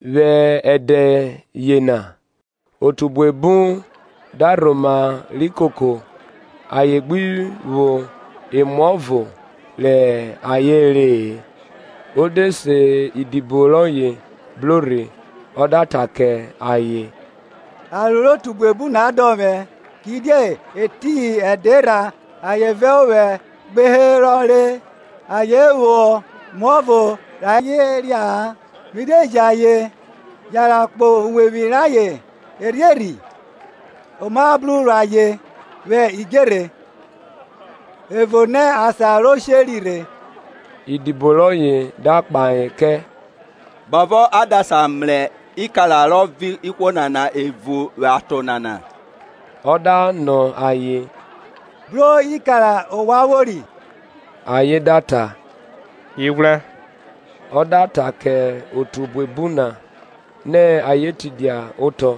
Vwẹ ẹdẹ yena otu buebu da rhoma ri koko ayen gbi vwo emuọvo rẹ ayen re-e, o de se idibo rọye bro rhe ọ da ta kẹ ayen, aro rẹ otu buebu na dọn vwẹ, kidie etiyin ẹdẹ erha ayen vẹ ovwẹ gbe herọ re, ayen vwo emuọvo rẹ ayen ria-a, mi de ji ayen yanran kpo uwevwi rayen erhierhi, oma bru ro ayen vwẹ idjerhe; ẹvo nẹ asan ro sheri rhe. Idibo rọye da kpahe kẹ, Bovọ a da sa mrẹ ikara rọ vọn ihwo nana evun vwẹ aton nana? Ọ da nọ ayen, bro ikara ovwan vwori? Ayen da ta, Ighwrẹ. Ọ da ta kẹ otu buebu na nẹ ayen tidia otọ;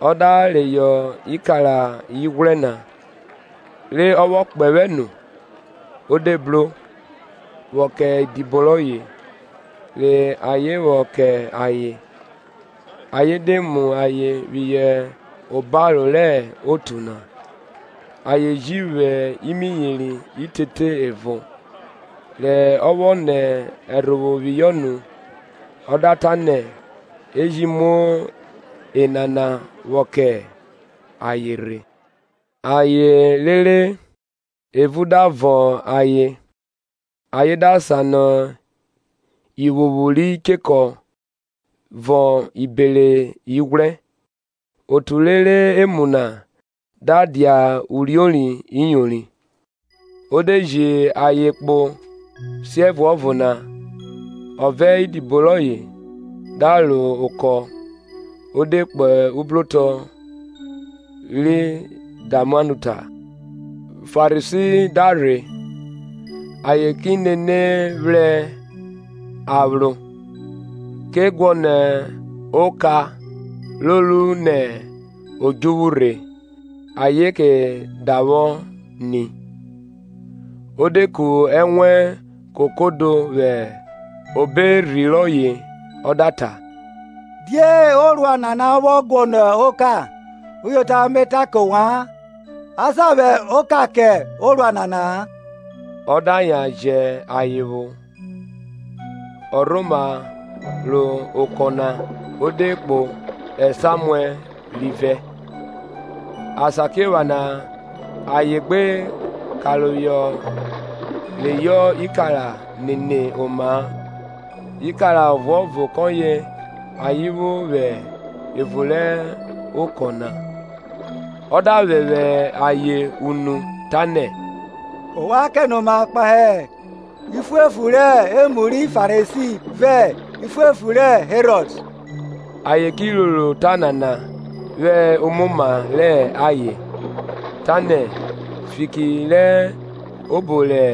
ọ da reyọ ikara ighwrẹ na, re ọ vwọ kpẹvwẹ nu, o de bro, vwọ kẹ idibo rọye, re ayen vwọ kẹ ayen; ayen de mu ayen phihọ obaro rẹ otu na. Ayen ji vwo imiyeri itete ẹvo. re ọ vwọ nẹ ẹrhovwo phihọ nu, ọ da ta nẹ e ji mu enana vwọ kẹ ayen rhe. Ayen re re, evun da vọn ayen. ayen da sanọ ivwuvwu ri chekọ vọn ibere ighwrẹ. Otu re re emu na da dia uriori iyori. O de ji ayen kpo siẹvuọvo na, ọ vẹ idibo rọye da ro okọ ọ de kpo ubrotọ ri Dalmanuta. Farisi da rhe, ayen ki nene phra aphro, ke guọnọ oka ro ru nẹ odjuvwu rhe, ayen ke davwọ nẹ. O de ku ẹnwẹn kokodo vwẹ obo erhi rọye ọ da ta, Die orua nana vwọ guọnọ oka? Uyota Me ta kẹ ovwan, Asa vwẹ oka kẹ orua nana-a. Ọ da yan jẹ ayen vwo, ọ rhoma ro okọ na o de kpo esamu rivẹ. Asakiephana ayen gbe karoho reyọ ikara nene oma-a; ikara ọvuọvo kọye ayen vwo vwẹ evun rẹ okọ na. Ọ da phẹphẹ ayen unu, tanẹ, Ovwan kẹnoma kpahe iphuephu re emu ri Farisi vẹ iphuephu rẹ Herọd. Ayen ki roro ota nana vwẹ omoma rẹ ayen, tanẹ, fiki rẹ obo rẹ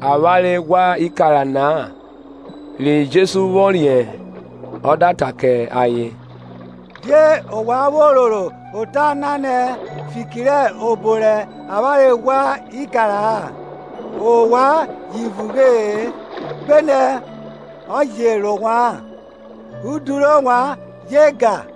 avwanre ghwa ikara-a na. Ri Jesu vwọ riẹn ọ da ta kẹ ayen, Die ovwan vwo roro ota na nẹ fiki rẹ obo ra avwanre ghwa ikara-a? Ovwan ji vughe-e, gbenẹ ọ je ro ovwa-an? Udu rẹ ovwan je gan?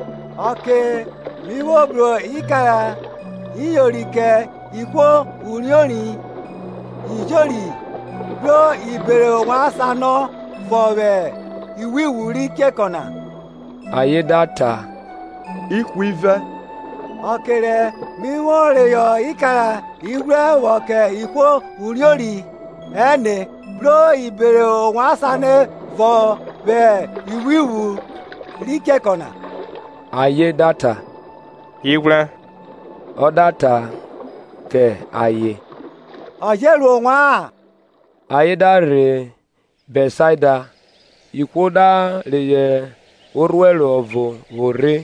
Ọke mi vwo bru ikara iyori kẹ ihwo uriori iyori bro ibere ovwan sanọ vọn vwẹ ivwuvwu ri chekọ na? Ayen da ta Ihwivẹ. Ọke rẹ mẹ vwo reyọ ikara ighwrẹ vwọ kẹ ihwo uriori ẹne bro ibere ovwan sanọ vọn vwẹ ivwuvwn ri chekọ na? Ayen da ta, Ighwrẹ. Ọ da ta ke ayen, Ọ je ro ovwa-an? Ayen da rhe Bẹtsaida. Ihwo da reyọ orhuẹro ọvo vwo rhe,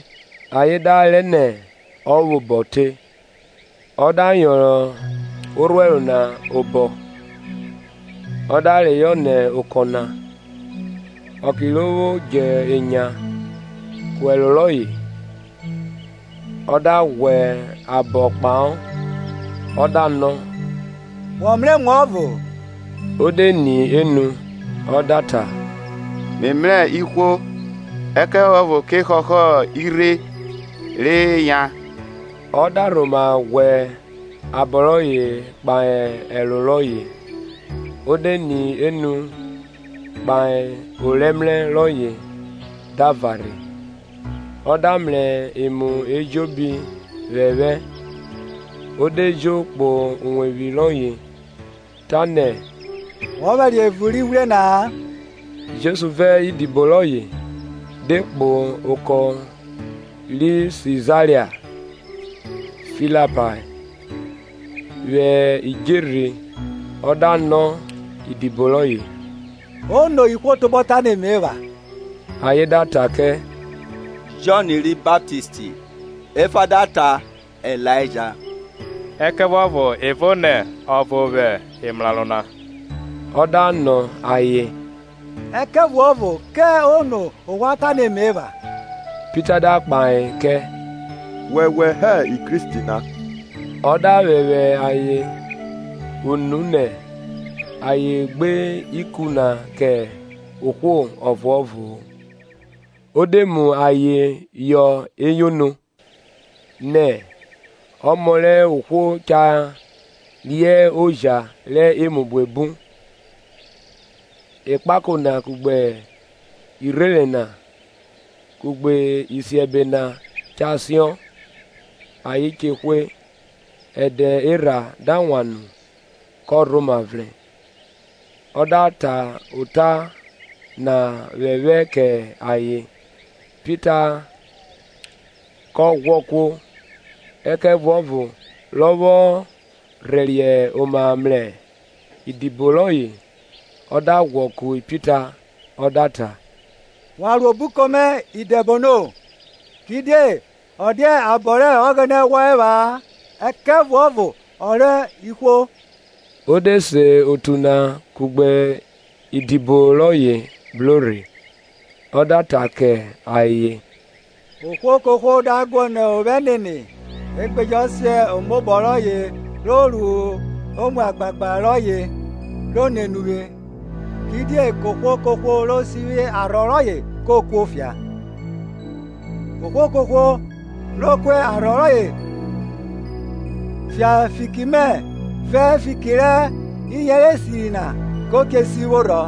ayen da rẹ nẹ ọ vwẹ obọ te. Ọ da yọnrọn orhuẹro na obọ, ọ da reyọ nẹ ọko na; ọke ro vwo dje enya ku ẹro rọye, ọ da ghwẹ abọ kpahọ, ọ da nọ, wọ mrẹ emuọvo? Ọ de ni enu, ọ da ta mẹ mrẹ ihwo; ẹkẹvuọvo ke họhọ irhe, re yan. Ọ da rhoma ghwẹ abọ rọye kpahe ẹro rọye, o de ni enu kpae orẹmrẹ rọye da varhe, ọ da mrẹ emu ejobi phephẹ. O de jo kpo uwevwi rọye, tanẹ wọ vwẹriẹ evun rẹ ighwrẹ na-a. Jesu vẹ idibo rọye de kpo ọko ri Sizaria Filipae. vwẹ idjerhe ọ da nọ idibo rọye, Ono ihwo tobọ ta ne Me epha? Ayen da ta kẹ, Jọn ri Baptist, efa da ta Ilaija, ẹkẹvuọvo evo nẹ, ọvo vwẹ emrarọ na. Ọ da nọ ayen, Ẹkẹvuọvo kẹ ono ovwan ta nẹ Me epha? Pita da kpahe kẹ, Wọwẹ hẹ Kristi na. Ọ da phẹphẹ ayen unu nẹ ayen gbe ikun na kẹ ohwo ọvuọvo-o. O de mu ayen họ eyono, nẹ, Ọmọ rẹ ohwo cha rẹ oja rẹ emu buebu, ẹkpako na, kugbe irherẹn na, kugbe isiẹbe ua cha siọn, ayen che hwe, ẹdẹ erha da wan nu kọ rhoma vrẹn. Ọ da ta ota na phephẹ kẹ ayen. Pita ke ghwọ kuo. Ẹkẹvuọvo rọ vwọ rhẹriẹ oma mrẹ idibo rọye ọ da ghwọ ku Pita, ọ da ta, Wan ro obuko mẹ, Idẹbono; kidie ọ dia abọ rẹ Ọghẹnẹ wo epha-a ẹkẹvuọvo ọ rẹ ihwo. O de se otu na kugbe idibo rọye bro rhe, ọ da ta kẹ ayen, Ohwo kohwo da guọnọ ovwẹ nene, e gbe jọ sen omobọ rọye ro mu agbagba rọye ro nene uvwe. Kidie kohwo kohwo ro sivwi arhọ rọye ko kuo fia; ohwo kohwo ro ku arhọ rọye fia fiki mẹ vẹ fiki rẹ iyẹnrẹ esiri na ke sivwo rhọ.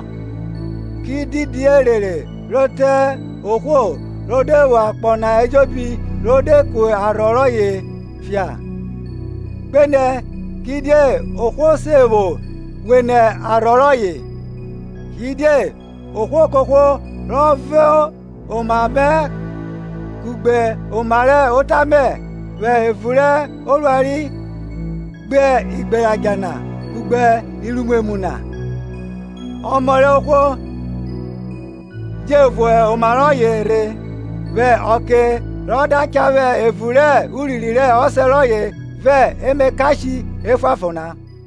Ki didi erere ri te ohwo, ro de vwo akpọ na ejobi ro de ku arhọ rọye fia? Gbenẹ kidie ohwo se vwo wene arhọ rọye? Kidie ohwo kohwo rọ vo oma mẹ kugbe oma rẹ ota mẹ vwẹ evun rẹ orua ri gbe igberadja na kugbe iruimwemwu nana, Ọmọ rẹ ohwo je vo oma rọye rhe, vwẹ ọke rọ da cha vwẹ evun rẹ urinrin rẹ Ọsẹ rọye vẹ emakashe efuanfon na.